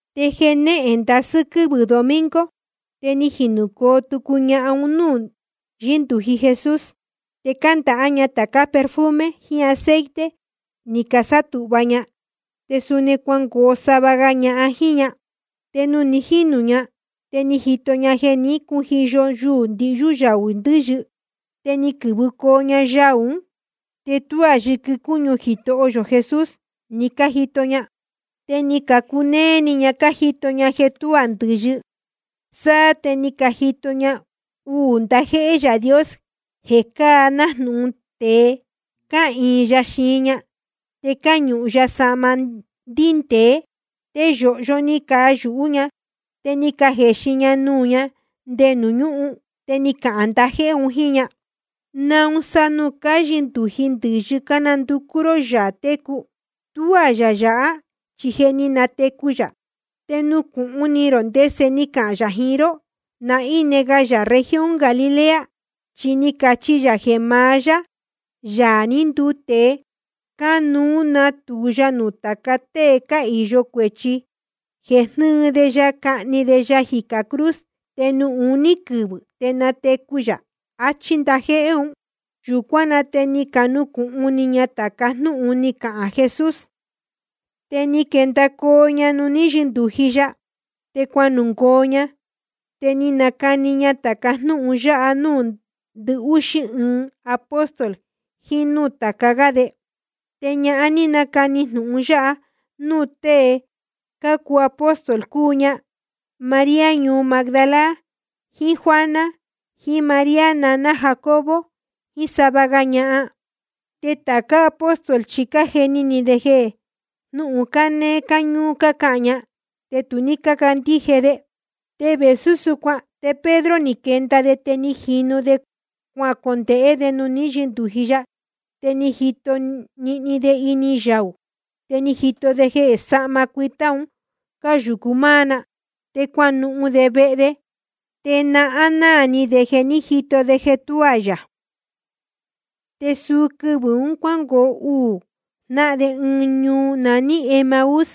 Te jenéhen ndasɨ́ quɨ́vɨ̄ domingo, te ni jinūcoo tucu ñahan un núū ní yɨndūji Jesús, te cándahá ña tācá perfume jiín aceite ni casátūhva ña. Te suni cuangoo sava ga ñahan jíín ña. Te nuū ni jínūcoo ña, te ni cajito ña jeē ní cujiyo yuū ndihyú yuyáú ndɨ̄yɨ. Te ni quɨ̄vɨcoo ña yaū ún, te tuá yɨquɨ cúñu Jitoho yō Jesús ni cájito ña. Te ni cacunéé ni ña cájito ña jeē tuá ndɨ̄yɨ. Sáá te ni cajito ña uū ndajéhé Yaā Dios jeē cáa nájnūhun tēe, cáhīin ya xiin ña, te cáñūhun ya sahma ndíndēé. Te yōhyo ni cayūhú ña, te ni cajexin ña nuū ña nde nuū ñúhun. Te ni cacahān ndajéhé un jíín ña: ¿Naun sa nuū cáyɨndūji ndɨ̄yɨ cánanducú ró Yaā técu? Tuá yā yāhá, chi je ni natecu yā. Te nucūhun ni rō ndese ni cahān yā jiín ró ná íne ga yā región Galilea. Chi ni cachi ya jeē maá yá, Yaā ní nduu tēe, cánuú natūu ya nuū tāca tée cáhīyo cuēchi, jeē jnɨɨ de ya cahni de ya jicā cruz, te nuū uní quɨvɨ̄ te natecu yā. Achí ndajéhé un. Yūcuán na te ni canucūhun ni ña tāca jnúhun ni cahān Jesús. Te ni quendacoo ña nuū ní yɨndūji ya, te cuanungoo ña. Te ni canacani ña tāca jnúhun yáha núū ndɨhúxí ɨɨn apóstol jiín núū tāca gá de. Te ñahan ní canacani jnūhun yáha núū tée cácuu apóstol, cúu ña María ñuu Magdala, jiín Juana, jiín María naná Jacobo, jiín sava ga ña. Te tācá apóstol chi cájeni ni de jeē jnúhun cánéé cáñúú cácahān ña, te tu ní cácandíje de. Te vēsú súcuan, te Pedro ni quenda de, te jínu de cuacondēhé de nuū ní yɨndūji ya. Te ni jito nihni de ini yaū, te ni jito de jeē sahma cuitá un cáyūcu máá na. Te cuanuhun de vehe de, te nahán náā ni de jeē ní jito de jeē tuá yā. Te suu quɨvɨ̄ un cuángoo uū jnáhan de ɨɨn ñuu naní Emaús,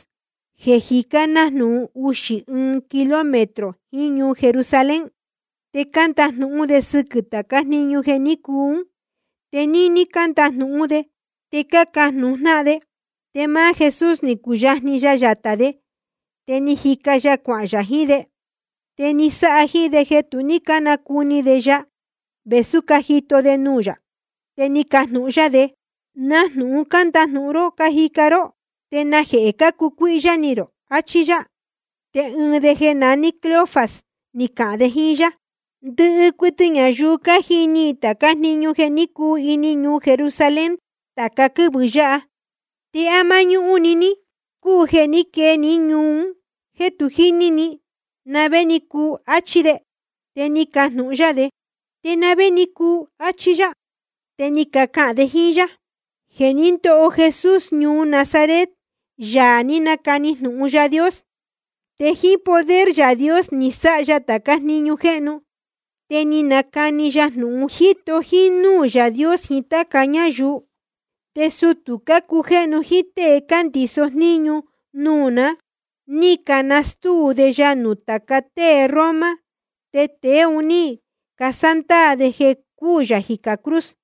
jeē jicá nájnūhun uxī ɨɨn kilómetro jiín ñuu Jerusalén. Te cándajnūhún de sɨquɨ̄ tācá jniñu jeē ní cuu ún. Te níní cándajnūhún de te cácajnūhun jnáhan de, te máá Jesús ni cuyajni ya yatā de, te jíca ya cuahān yā jiín de. Te ni sáha jíín de jeē tu ní cánacuni de ya, vēsú cájito de nuū yā. Te ni cajnūhun yá de: ¿Na jnūhun cándajnūhun ró cájica ró? ¿Te najehē cácucuíhyá ni rō? Achí yá. Te ɨɨn de jeē naní Cleofas ni cahān de jíín yá: Ndɨhɨ cuɨtɨ ñayuu cájini i tācá jniñu ní cuu ini ñuu Jerusalén tāca quɨ́vɨ̄ yáha. ¿Te á máñúhún‑ni níhín cúu jeē ní quee ní ñuu un jéē tu jíní ni na vé ni cuu? Achí de. Te ni cajnūhun yá de: ¿Te na vé ni cuu? Achí yá. Te ni cacahān de jíín yá: Jeē ní ndoho Jesús ñuu Nazaret, Yaā ní nacani jnūhun Yaā Dios. Te jíín poder Yaā Dios ni sáha ya tācá jniñu jéhnu te ni nacani ya jnūhun, jíto jínúū Yaā Dios jiín táca ñáyuu. Te sutū cácujéhnu jíín tée cándiso jníñu nuū ná, ni canastúu de ya nuū tāca tée Roma, te tēe un ní casándaā de jeē cúū yā jicā cruz.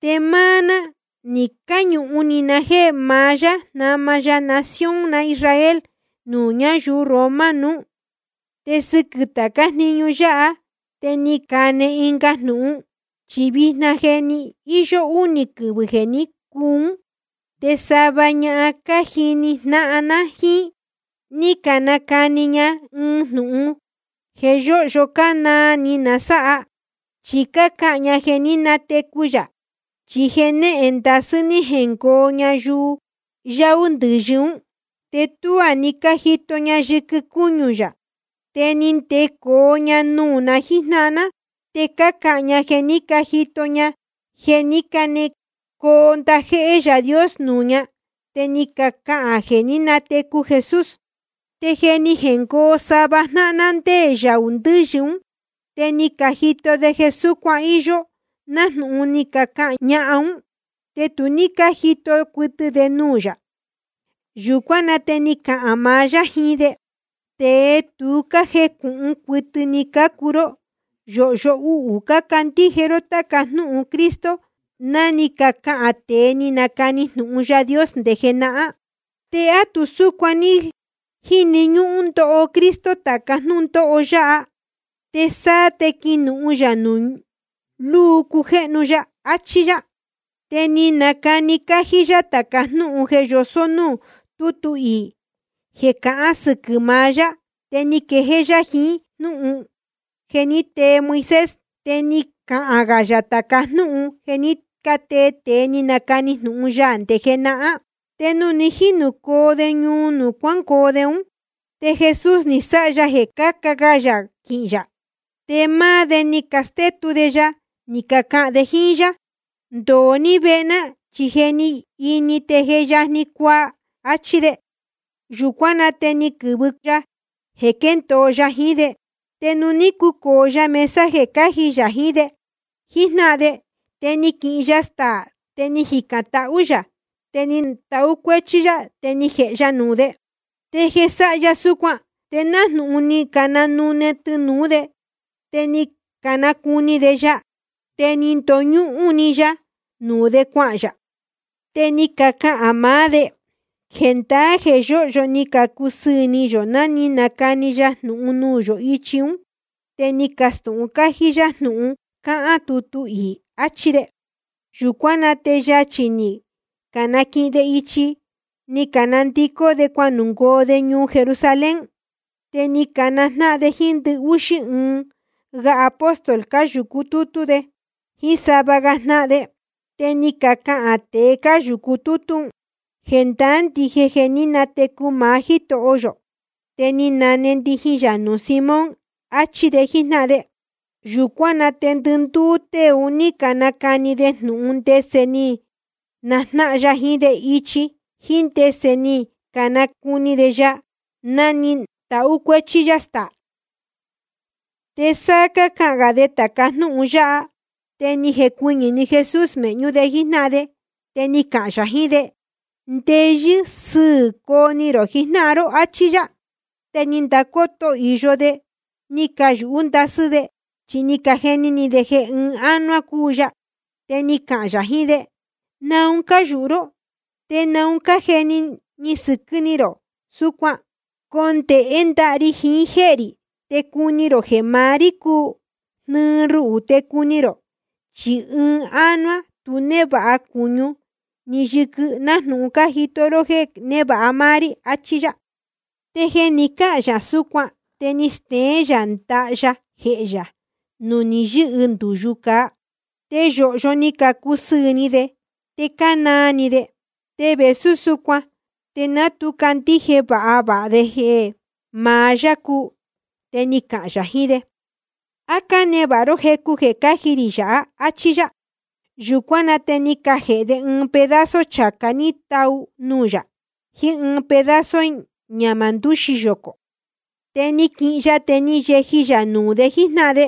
Te máá ná ní cañūhun ni na jéē maá yá jnama ya nación na Israel nuū ñáyuu Roma nuú. Te sɨquɨ̄ tācá jniñu yáha, te ni cane ɨnga jnūhun. Chi vijna je íyó únī quɨvɨ̄ jeē ní cuu ún. Te sava ñahan cájini jnáhan ná jíín, ni canacani ña ɨɨn jnūhun jeē yóhyo cánaa ni na sáha, chi cácahān ña jeē ní natecu yā. Chi jenéhen ndasɨ́ ní jengoo ña yaū ndɨ̄yɨ ún. Te tuá ni cájito ña yɨquɨ cúñu yā. Te ni ndecoo ña nuū na jíjnáhan ná, te cácahān ña jeē ní cajito ña jeē ní canecoo ndajéhé Yaā Dios nuū ña, te ni cacahān jeē ní natecu Jesús. Te ni jengoo sava jnáhan ná ndé yaū ndɨ̄yɨ ún, te ni cajito de jeē súcuan íyó, nájnūhun ni cacahān ñahan ún, te tu ní cájito cuɨtɨ de nuū yā. Yūcuán na te ni cahān maá yá jiín de: Tēe tu cájecūhun cuɨtɨ ni cácuu ró. Yōhyo uhū cácandíje ró táca jnúhun Cristo ni cacahān tēe ni canacani jnūhun Yaā Dios nde jenahán. ¿Te á tu súcuan ní jíni ñúhún ndoho Cristo tāca jnúndóho yáha, te sáá te quinuhun yā nuū lúu cujéhnu ya? Achí yá. Te ni nacani cájí yá tāca jnúhun jeē yosó núū tútu iī jeē cahán sɨquɨ̄ maá yá. Te ni quejéé yá jiín jnúhun ni tee Moisés, te ni cahān gā yā tāca jnúhun jeē ní catee tēe ni canacani jnūhun ya nde jenahán. Te nuū ni jínūcoo de ñuu nuū cuángoo de ún, te Jesús ni sáha ya jeē cáca ga yā quihīn yā. Te máá de ni castétu de ya, ni cacahān de jíín yá: Ndōo ní vehe ná, chi je ni ini te je yajni cuaa, áchí de. Yūcuán na te ni quɨ̄vɨ ya jeē quéndōo ya jiín de. Te nuū ní cucōo ya mesa jeē cáji yā jiín de jíjnáhan de, te ni quihin ya staā, te ni jicān tahú yā, te ni tahú cuéchí yá, te ni jēhe ya nuū de. Te jeē sáha ya súcuan, te nájnūhun ni cananune tɨnūú de, te ni canacuni de ya. Te ni ndoñúhún‑ni ya nuū de cuahān yā. Te ni cacahān maá de: Jendaá jeē yóhyo ni cacusɨɨ̄ ni yō ná ni nacani ya jnūhun nuū yō ichi ún te ni castūhun cájí yá jnūhun cáhán tutu iī. Achí de. Yūcuán na te yachī ni canaquihin de ichi, ni canandicó de cuanungoo de ñuu Jerusalén. Te ni canajnáhan de jíín ndɨhúxí ɨɨn ga apóstol, cáyūcu tútú de jíín sava ga jnáhan de. Te ni cacahān tēe cáyūcu tútú un: Jendaá ndije jeē ní natecu maá Jítoho yō, te ni nane ndijin yā nuū Simón, achí de jíjnáhan de. Yūcuán na te ndɨndúú tée un ní canacani de jnūhun ndese ni najnáhan ya jiín de ichi, jíín ndese ni canacuni de ya ná ni tahú cuéchí yá staā. Te sá cácahān gā de tāca jnúhun yáha, te ni jecuɨñɨ̄‑ni Jesús mēhñú de jíjnáhan de. Te ni cahān yā jiín de: Ndeyɨ́ sɨ́ɨ̄ coo ni rō jijnáhan ró, áchí yá. Te ni candacoto īyo de, ni cayūhú ndasɨ́ de, chi ni cajeni ni de jeē ɨɨn ánuá cúu ya. Te ni cahān yā jiín de: ¿Naun cáyūhu ró, te naun cájeni sɨquɨ́ ni rō súcuan? Condēhé ndaha ri jiín jéhē rī, te cuni rō jeē maá rí cúu. Jnɨɨ ruhū te cuni rō, chi ɨɨn ánuá tu névāha cūñu ni yɨquɨ nájnūhun cájito ró jéē névāha máá rí, achí yá. Te jeē ni cáhān yā súcuan, te ni steén yā ndaha ya jehē yā nuū ni yɨ́hɨ ndūyu cāa. Te yōhyo ni cacusɨɨ̄ ni de, te cánaa ni de. Te vēsú súcuan te ná tu candíje vāha vāha de jeē maá yá cúu. Te ni cahān yā jiín de: ¿A cánevāha ró jecu jeē cáji rī yāhá? áchí yá. Yūcuán na te ni cajēhe de ɨɨn pedazo chācá ní tau nuū yā, jiín ɨɨn pedazo ñahmā ndūxi yocō. Te ni quihin ya, te ni yeji yā nuū de jíjnáhan de.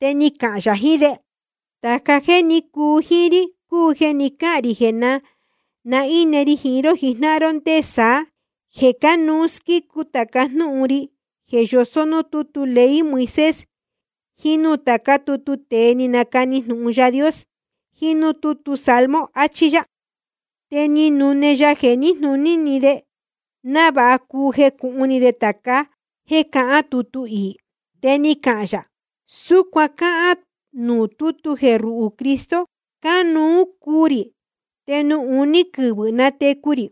Te ni cahān yā jiín de: Tāca jéē ní cuu jíín rí cúu jeē ni cáhān rī ná ni ine ri jiín ró jíjnáhan ró ndé saá, jeē cánuú squícu tāca jnúhun ri jeē yosó núū tútu ley Moisés, jiín núū tācá tutu tēe ni canacani jnūhun Yaā Dios, jiín núū tútu salmo, achí yá. Te ni nune ya jeē níjnūní de, návāha cuu jecūhun ni de tāca jéē cahán tutu iī. Te ni cahān yā: Súcuan cáhán nuū tútu jeē ruhū Cristo, cánuú cuu rī, te nuū uní quɨvɨ̄ natecu rī.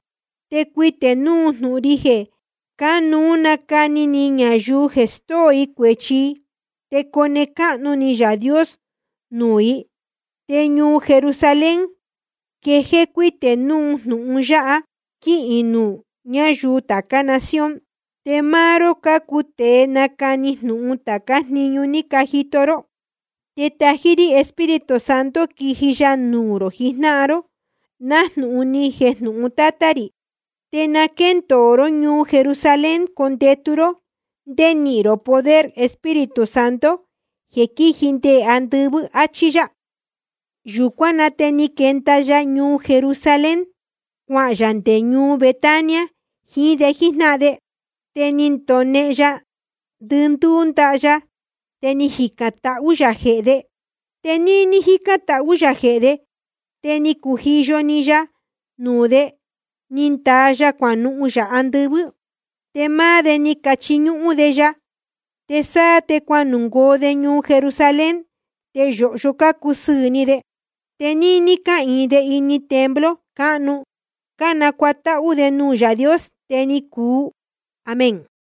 Te cuitē núu jnūhun ri jeē cánuú nacani ni ñayuu jeē stóo i cuēchi i, te cone cáhnu ni Yaā Dios nuū i. Te ñuu Jerusalén quejéé cuítē núu jnūhun yáha, te quihīn nuū ñáyuu tācá nación. Te máá ró cácuu tēe nacani jnūhun tācá jniñu ní cajito ró. Te tají rí Espíritu Santo quiji ya nuū rō jijnáhan ró, nájnūhun ni jejnūhun Tátá rī. Te na quéndōo ró ñuu Jerusalén condetu ró ndé nihīn rō poder Espíritu Santo jeē quíji nde andɨvɨ́. Achí yá. Yūcuán na te ni quenda ya ñuu Jerusalén, cuahān yā nde ñuu Betania jiín de jíjnáhan de. Te ni ndonehen ya ndɨndúú ndaha ya, te ni jicān tahú yā jehē de. Te níní jícán tahú yā jehē de, te ni cujiyo‑ni ya nuū de, ni ndaa ya cuanuhun yā andɨvɨ́. Te máá de ni cachiñúhún de ya. Te sáá te cuanungoo de ñuu Jerusalén, te yōhyo cácusɨɨ̄ ni de. Te níní cáhīin de ini templo cáhnu, cánacuatáhú de nuū Yaā Dios. Te ni cuu. Amén.